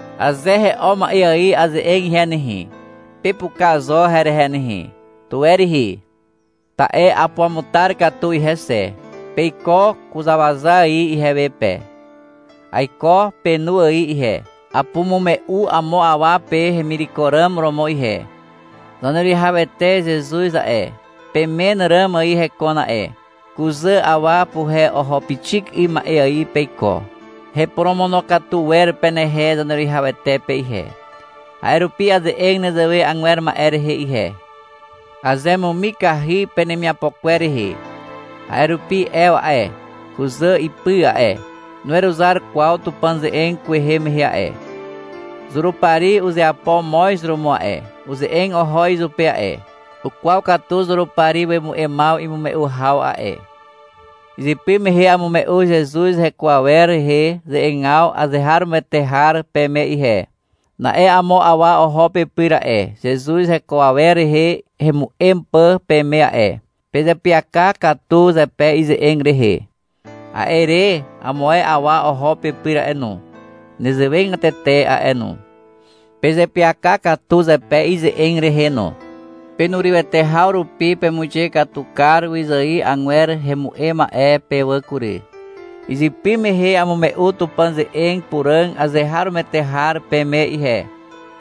Aze he'o ma'e ài aze'eg ihe nehe, pepuka zo herehe nehe. Tuwe rihi. Ta'e apuamutar katu ihe xe. Peiko kuzàwaza ài ihewe pe. Aiko penu ài ihe. Apumume'u amo awa pe hemireko ràm romo ihe. Zaneruwihawete Zezuz a'e, pemen ràm ài hekon a'e. Kuzà awa puhe oho pixik 'ym ma'e ài peiko. Heporomonokatu wer penehe Zaneruwihawete pe ihe. A'e rupi aze'eg nezewe agwer ma'e rehe ihe. Azemumikahy penemiapo kwer rehe. A'e rupi Ew a'e, kuzà ipy a'e, nuweruzar kwaw Tupàn ze'eg kwehe mehe a'e. Zurupari uzeapo moz romo a'e, uze'eg oho izupe a'e. Ukwaw katu Zurupari wemu'emaw imume'u haw a'e. Izypy mehe amume'u Zezuz heko awer rehe ze'egaw azeharomoete har peme ihe. Na'e amo awa oho pepyr a'e, Zezuz heko awer rehe hemu'em pà peme a'e. Pezeapyaka katu zepe ize'eg rehe. A'e re amo ae awa oho pepyr a'e no. Nezewegatete a'e no. Pezeapyaka katu zepe ize'eg rehe no. Penurywete haw rupi pemuixe katu kar wyzài agwer hemu'em ma'e pe wà kury. Izypy mehe amume'u Tupàn ze'eg puràg azeharomoete har peme ihe.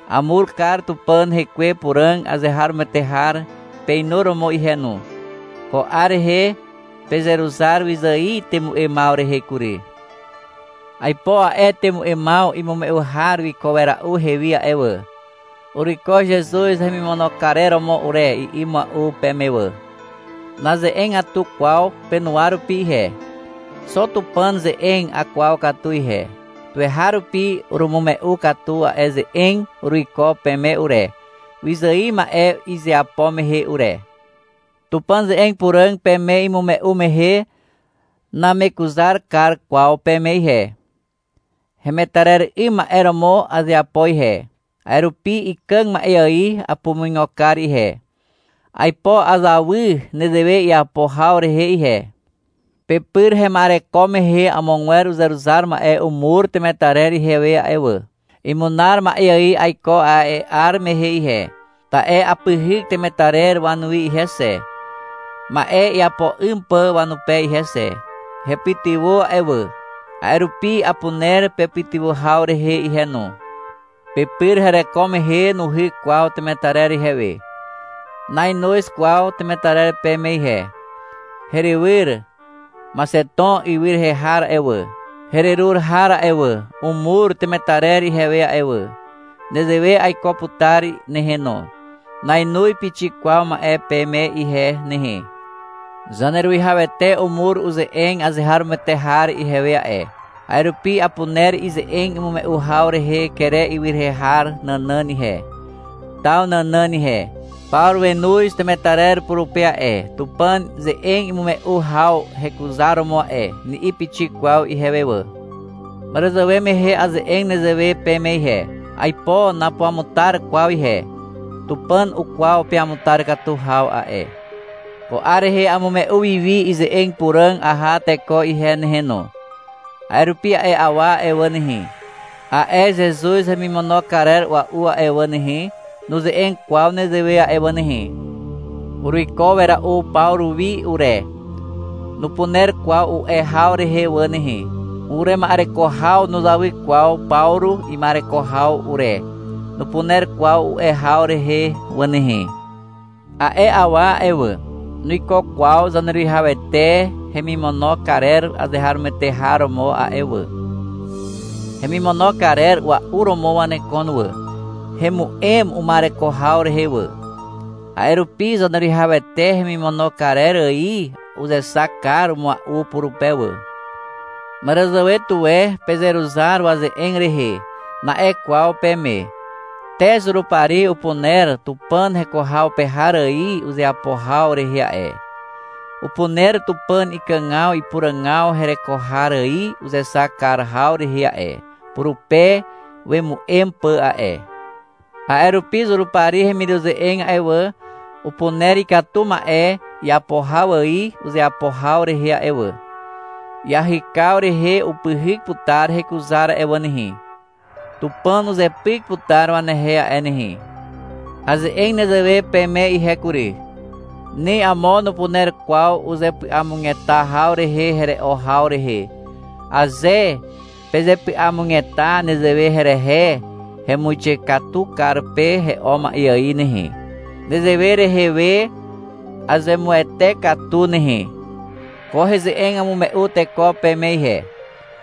Amur kar Tupàn Hekwe Puràg azeharomoete har peinuromo ihe no. Ko 'ar rehe pezeruzar wyzài temu'emaw rehe kury. Aipo a'e temu'emaw imume'u har wiko wera'u ihewi a'e wà. — Uruiko Zezuz hemimono karer romo ure, i'i mua'u peme wà. Naze'egatu kwaw penuwa rupi ihe. Xo Tupàn ze'eg akwaw katu ihe. Tuweharupi urumume'u katu a'e ze'eg uruiko peme ure, wyzài ma'e izeapo mehe ure. Tupàn ze'eg puràg peme imume'u mehe namekuzar kar kwaw peme ihe. Hemetarer 'ym ma'e romo azeapo ihe. A'e rupi ikàg ma'e ài apumuigo kar ihe. Aipo azawy nezewe iapo haw rehe ihe. Pepyr hema'ereko mehe amogwer uzeruzar ma'e umur temetarer ihewe a'e wà. Imunar ma'e ài aiko a'e 'ar mehe ihe, ta'e apyhyk temetarer wanuwi ihe xe, ma'e iapo 'ym pà wanupe ihe xe. Hepytywà a'e wà, a'e rupi apuner pepytywà haw rehe ihe no. Pepyr hereko mehe nuhyk kwaw temetarer ihewe. Nainoz kwaw temetarer peme ihe. Herywyr Maxeton ywy rehe har a'e wà, hererur har a'e wà, umur temetarer ihewe a'e wà. Nezewe aiko putar nehe no. Nainoz pixik kwaw ma'e peme ihe nehe. Zaneruwihawete umur uze'eg azeharomoete har ihewe a'e. A'e rupi apuner ize'eg imume'u haw rehe Kere ywy rehe har nànàn ihe, taw nànàn ihe. — Pawru wenoz temetarer purupe a'e, Tupàn ze'eg imume'u haw hekuzaromo a'e, ni'i pixik kwaw ihewe wà. Màràzàwe mehe aze'eg nezewe peme ihe. Aipo napuamutar kwaw ihe. Tupàn ukwaw peamutar katu haw a'e. Ko 'ar rehe amume'u wi wi ize'eg puràg aha teko ihe nehe no. A'e rupi a'e awa a'e wà nehe, a'e Zezuz hemimono karer a'ua'u a'e wà nehe, nuze'eg kwaw nezewe a'e wà nehe. — Uruiko wera'u Pawru wi ure, nupuner kwaw u'e haw rehe wà nehe. — Urema'ereko haw nuzawy kwaw Pawru ima'ereko haw ure, nupuner kwaw u'e haw rehe wà nehe. A'e awa a'e wà, nuiko kwaw Zaneruwihawete hemimono karer azeharomoete har romo a'e wà. Hemimono karer ua'u romo wanekon wà. Hemu'em uma'ereko haw rehe wà. A'e rupi Zaneruwihawete hemimono karer ài uzexak kar mua'u purupe wà. — Màràzàwe tuwe pezeruzar waze'eg rehe, na'e kwaw peme. Te Zurupari upuner Tupàn heko haw pe har ài uzeapo haw rehe a'e. Upuner Tupàn ikàgaw ipuràgaw hereko har ài uzexak kar haw rehe a'e, purupe wemu'em pà a'e. A'e rupi Zurupari hemiruze'eg a'e wà, upuner ikatu ma'e iapo har ài uzeapo haw rehe a'e wà. Iahykaw rehe upyhyk putar hekuzar a'e wà nehe. Tupàn uzepyk putar wanehe a'e nehe. Aze'eg nezewe peme ihe kury. Ni amo nupuner kwaw uzepy'amugeta haw rehe here'o haw rehe. Aze pezepy'amugeta nezewe herehe, hemuixe katu kar pe he'o ma'e ài nehe. Nezewe rehe we azemuwete katu nehe. Ko heze'eg amume'u teko peme ihe.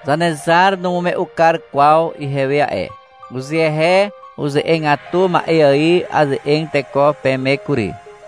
Zanezar numume'u kar kwaw ihewe a'e. Uzehe uze'egatu ma'e ài aze'eg teko peme kury.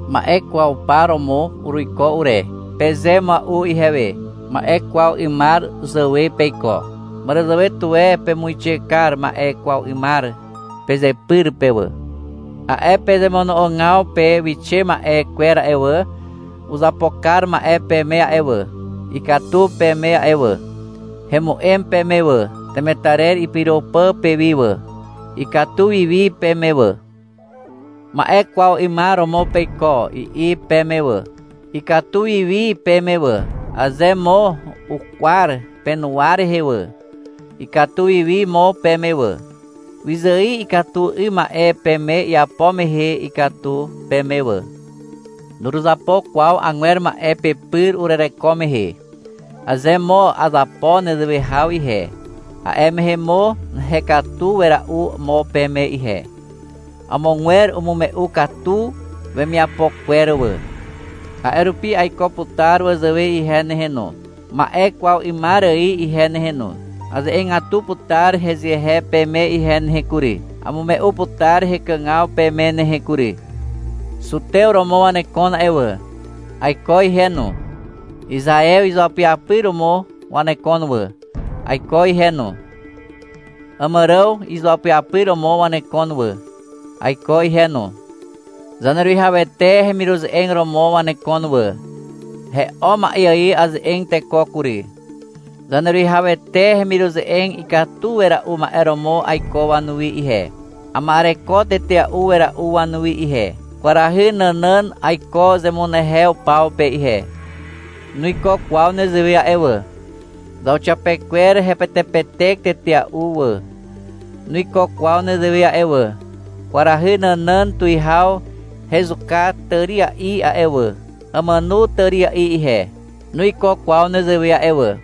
— Ma'e kwaw par romo uruiko ure, peze mua'u ihewe. Ma'e kwaw 'ymar zàwe peiko. Màràzàwe tuwe pemuixe kar ma'e kwaw 'ymar pezepyr pe wà. A'e pezemono'ogaw pe wixe ma'e kwer a'e wà, uzapo kar ma'e peme a'e wà. Ikatu peme a'e wà. Hemu'em peme wà, temetarer ipyro pà pewi wà. Ikatu wi wi peme wà. — Ma'e kwaw 'ymar romo peiko, i'i peme wà. Ikatu wiwi peme wà. Aze mo ukwar penuwa rehe wà, ikatu wiwi mo peme wà. Wyzài ikatu 'ym ma'e peme iapo mehe ikatu peme wà. Nuruzapo kwaw agwer ma'e pepyr urereko mehe. Aze mo azapo nezewe haw ihe, a'e mehe mo hekatu wera'u mo peme ihe. Amogwer umume'u katu wemiapo kwer wà. A'e rupi aiko putar wazàwe ihe nehe no, ma'e kwaw 'ymar ài ihe nehe no. Aze'egatu putar hezehe peme ihe nehe kury. Amume'u putar hekàgaw peme nehe kury. Zutew romo wanekon a'e wà. Aiko ihe no. Izaew izuapyapyr romo wanekon wà. Aiko ihe no. Àmàràw izuapyapyr romo wanekon wà. Aiko ihe no. Zaneruwihawete hemiruze'eg romo wanekon wà. (He'o ma'e ài aze'eg teko kury.) Zaneruwihawete hemiruze'eg ikatu wera'u ma'e romo aiko wanuwi ihe. Ama'ereko tetea'u wera'u wanuwi ihe. Kwarahy nànàn aiko zemunehew paw pe ihe. Nuiko kwaw nezewe a'e wà. Zauxiapekwer hepetepetek tetea'u a'e wà. Nuiko kwaw nezewe a'e wà. Kwarahy nànàn tuwihaw hezuka tària'i a'e wà, amàno tària'i ihe. Nuiko kwaw nezewe a'e wà.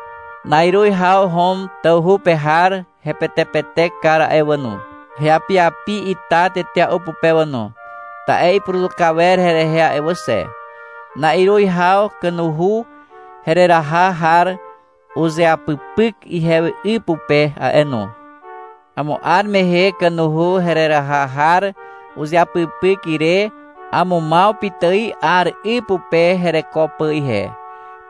Na'iruz haw Hom tawhu pe har hepetepetek kar a'e wà no. Heapiapi ita tetea'u pupe wà no, ta'e ipuruzuka wer herehe a'e wà xe. Na'iruz haw kanuhu hereraha har uzeapypyk ihewi 'y pupe a'e no. Amo 'ar mehe, kanuhu hereraha har uzeapypyk ire, amumaw pitài 'ar 'y pupe hereko pà ihe.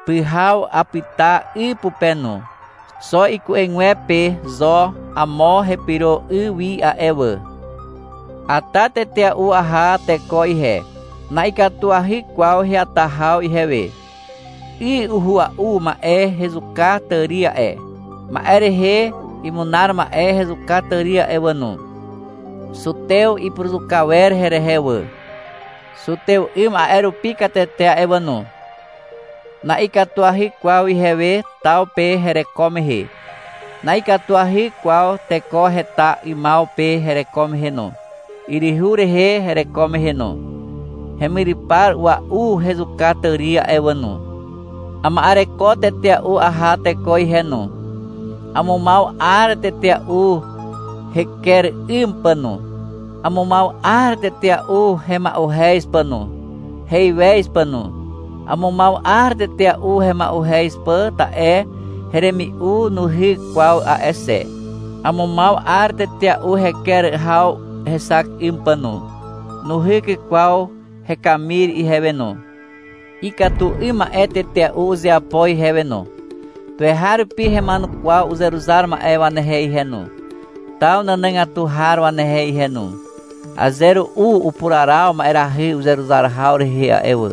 Pyhaw apyta 'y pupe no. (Xo iku'egwepe zo amo hepyro 'y wi a'e wà.) Ata tetea'u aha teko ihe. Na'ikatuahy kwaw heata haw ihewe. 'Y uhua'u ma'e hezuka tàri a'e. Ma'e rehe imunar ma'e hezuka tàri a'e wà no. Zutew ipuruzuka wer herehe wà. Zutew 'ym a'e rupi katete a'e wà no. Na'ikatuahy kwaw ihewe taw pe hereko mehe. Na'ikatuahy kwaw teko heta 'ymaw pe hereko mehe no, yryhu rehe hereko mehe no. Hemyrypar a'ua'u hezuka tàri a'e wà no. Ama'ereko tetea'u aha teko ihe no. Amumaw 'ar tetea'u heker 'ym pà no. Amumaw 'ar tetea'u hema'uhez pà no, heiwez pà no. Amumaw 'ar tetea'u hema'uhez pà ta'e heremi'u nuhyk kwaw a'e xe. Amumaw 'ar tetea'u heker haw hexak 'ym pà no. Nuhyk kwaw hekamir ihewe no. Ikatu 'ym ma'e tetea'u uzeapo ihewe no. Tuweharupi hema'enukwaw uzeruzar ma'e wanehe ihe no, taw nànàgatu har wanehe ihe no. — Aze ru'u upuraraw ma'erahy uzeruzar haw rehe a'e wà,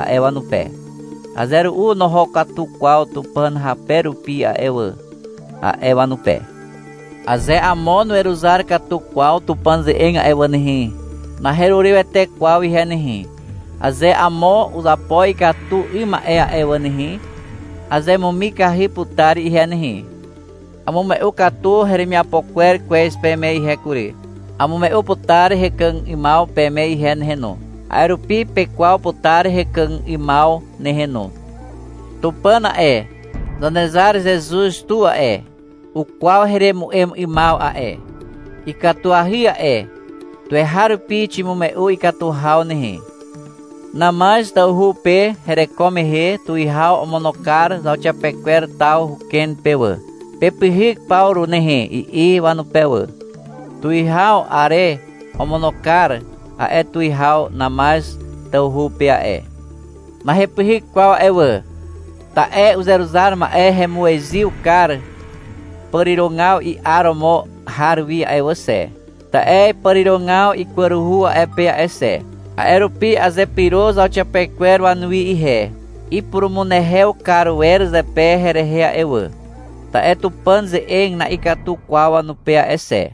a'e wanupe. — Aze ru'u noho katu kwaw Tupàn hape rupi a'e wà, a'e wanupe. Aze amo nuweruzar katu kwaw Tupàn ze'eg a'e wà nehe, naherurywete kwaw ihe nehe. Aze amo uzapo ikatu 'ym ma'e a'e wà nehe, azemumikahy putar ihe nehe. Amume'u katu heremiapo kwer kwez peme ihe kury. Amume'u putar hekàg 'ymaw peme ihe nehe no. A'e rupi pekwaw putar hekàg 'ymaw nehe no. Tupàn a'e, Zanezar Zezuz tu a'e, ukwaw heremu'em 'ymaw a'e. Ikatuahy a'e. Tuweharupi ximume'u ikatu haw nehe. Namaz tawhu pe hereko mehe tuwihaw omono kar zauxiapekwer taw huken pe wà. — Pepyhyk Pawru nehe, i'i wanupe wà. (Tuwihaw Are omono kar a'e tuwihaw Namaz tawhu pe a'e.) Nahepyhyk kwaw a'e wà. Ta'e uzeruzar ma'e hemuezyw kar pàrirogaw i'aromo har wi a'e wà xe, ta'e pàrirogaw ikwaruhu a'e pe a'e xe. A'e rupi azepyro zauxiapekwer wanuwi ihe. (Ipurumunehew kar wer zepe herehe a'e wà, ta'e Tupàn ze'eg na'ikatu kwaw wanupe a'e xe.)